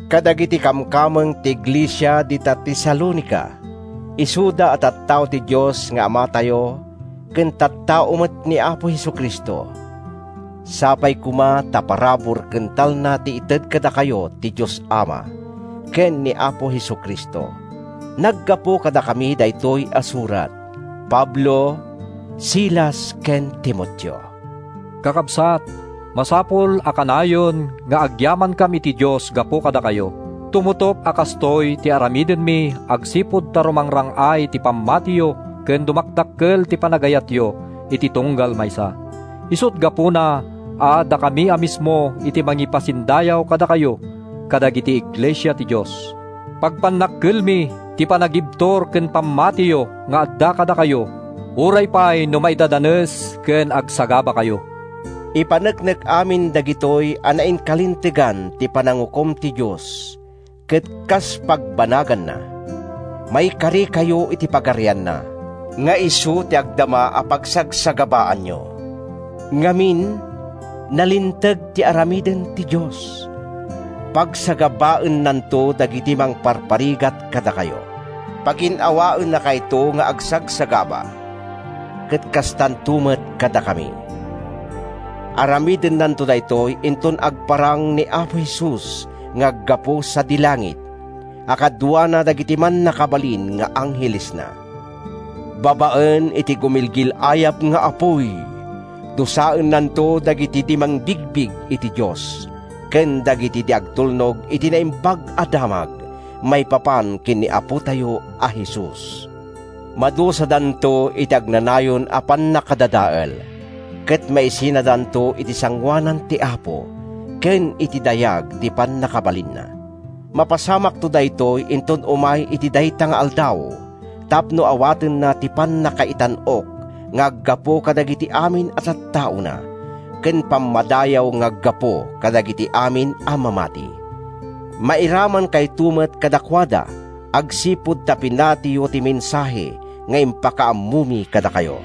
Kadagiti kamkameng ti iglesia dita Tesalonica, isuda a tattao ti Dios nga Amatayo ken tattao met ni Apo Jesu-Cristo, Sapay koma ta parabur ken talna ti ited kadakayo ti Dios Ama, ken ni Apo Jesu-Cristo. Naggapu kadakami daytoy a surat—Pablo, Silas ken Timoteo. Kakabsat, masapul a kanayon nga agyamankam iti Dios gapu kadakayo. Tumutop a kastoy ti aramidenmi agsipud ta rumangrang-ay ti pammatiyo ken dumakdakkel ti panagayatyo iti tunggal maysa. Isut’ gapuna a dakami a mismo ti mangipasindayaw kadakayo kadagiti iglesia ti Dios. Pagpannakkelmi ti panagibtur ken pamamatiyo nga adda kadakayo uray pay no maidaddadanes ken agsagabakayo. Ipaneknek amin dagitoy a nainkalintegan ti panangukom ti Dios ket kas pagbanaganna, maikarikayo iti Pagarianna, nga isu ti agdama a pagsagsagabaanyo. Ngamin, nalinteg ti aramiden ti Dios: Pagsagabaennanto dagiti mangparparigat kadakayo. Pagin-awaennakayto nga agsagsagaba, ket kastanto met kadakami. Aramidennanto daytoy inton agparang ni Apo Jesus nga aggapu sadi langit, a kaduana dagiti mannakabalin nga anghelesna. Babaen iti gumilgil-ayab nga apuy, dusaennanto dagiti di mangbigbig iti Dios ken dagiti di agtulnog iti Naimbag a Damag maipapan ken ni Apotayo a Jesus. Madusadanto iti agnanayon a pannakadadael, ket maisinadanto iti sangoanan ti Apo ken iti dayag ti pannakabalinna. Mapasamakto daytoy inton umay iti dayta nga Aldaw tapno awatenna ti pannakaitan-ok nga aggapu kadagiti amin a tattaona ken pammadayaw nga aggapu kadagiti amin a mamati. Mairamankayto met kadakuada agsipud ta pinatiyo ti mensahe nga impakaammomi kadakayo.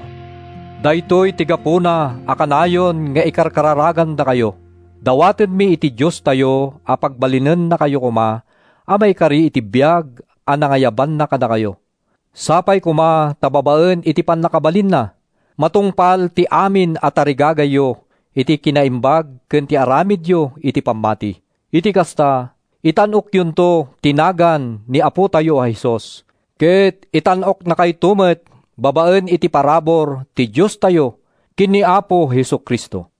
Daytoy ti gapuna a kanayon nga ikarkararagandakayo. Dawatenmi iti Diostayo a pagbalinennakayo koma a maikari iti biag a nangayabanna kadakayo. Sapay koma ta babaen iti pannakabalinna, matungpal ti amin a tarigagayyo iti kinaimbag ken ti aramidyo iti pammati. Iti kasta, itan-okyonto ti nagan ni Apotayo a Jesus, ket itan-oknakayto met babaen iti parabur ti Diostayo ken ni Apo Jesu-Cristo.